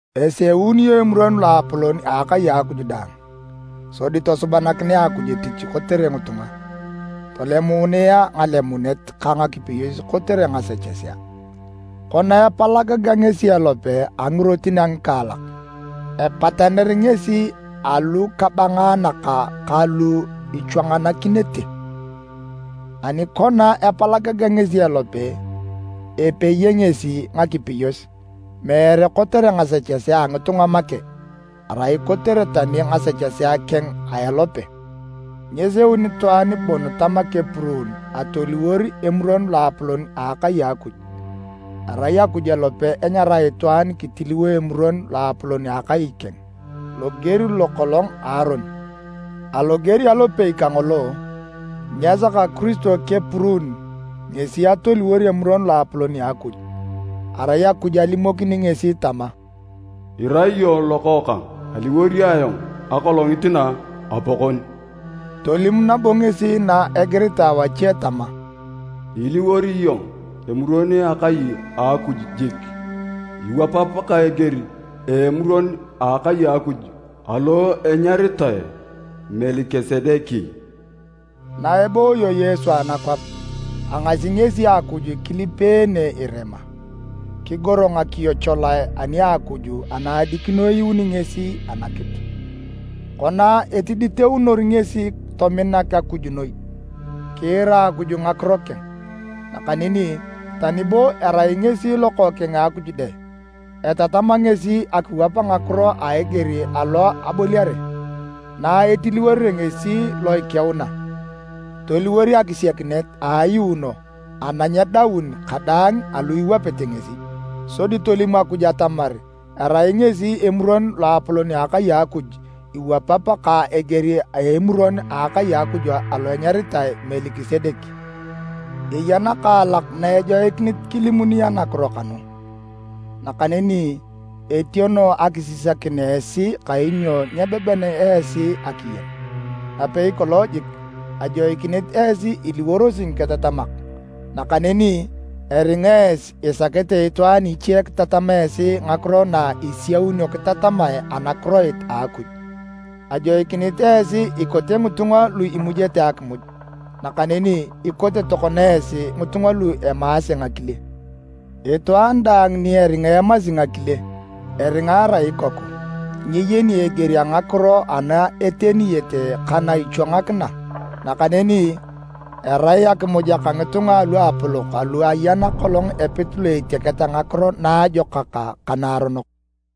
Eseunio Emuron Loapolon a akai a Akuj daang, sodi tosubanakinea Akuj etich kotere ngitunga, tolemuununea ngalemunet ka ngakipeyos kotere ngasechesea. Kona epalagagea ngesi elope a ngirotin a ngikaalak, epataner ngesi alukabangaanak ka lu ichwanganakinete. Ani kona epalagagea ngesi elope, ipeye ngesi ngakipeyos, meere kotere ngasechesea a ngitunga make, erai kotere tani ngasechesea keng a elope. Nyeseun itwaan bon tama kepuruun atoliwor Emuron Loapolon a akai a Akuj, erai Akuj alope enyarae itwaan kitiliwo Emuron Loapolon a Akai a keng, loger lo kolong a Aron. Aloger alopei kangolo, nyesaka Kiristo kepuruun ngesi atoliwor Emuron Loapolon a Akuj, arai Akuj alimokini ngesi tama, “Irai iyong Lokookang, aliwor ayong akolongit na Apakon.” Tolim nabo ngesi na igiritae wache tama, “Iliwor iyong emuron a akai a Akuj jik. Iwapap ka eger a Emuron a akai a Akuj alo enyaritae Melikisedek.” Na ebooyo Yesu anakwap, agasi ngesi Akuj kilipeene irema, kigoro ngakiyo cholae ani a Akuj ana adikino eyuuni ngesi anakitu. Kona etiditeunor ngesi tomina Akuj noi, kiira Akuj ngakiro keng. Nakaneni tani bo erai ngesi Lokookeng a Akuj dang, etatama ngesi akiwap ngakiro a eger alo aboliare. Na etiliworere ngesi lo ikiuna, toliwor akisiakinet a ayuuno ana nyedaun kadaang alu iwapete ngesi, sodi tolim Akuj atamar erai ngesi Emuron Loapolon a akai a Akuj iwapap ka eger a emuron akai a Akuj alo enyaritae Melikisedek. Eya nakaalak na ejoikinit kilimuni anakiro kanu, nakaneni etiono akisisakin esi kainyo nyebeben esi akiyen. Napei kolong jik ajoikinit esi iliworosi ngiketatamak, nakaneni eringa esi isakete itwaan iche kitatam esi ngakiro na isiaunio kitatamae anakiroit a Akuj. Ajoikinit esi ikote ngitunga lu imujete akimuj, nakaneni ikote tokona esi ngitunga lu emaase ngakile. Itwaan daang ni eringa emasi ngakile, eringa erai ikoku, nyeyeni eger a ngakiro ana eteniyete ka na ichwangakina. Nakaneni, erai akimuj aka ngitunga aluapolok alu ayan kolong epit lo etiaketa ngakiro naajokak ka naaronok.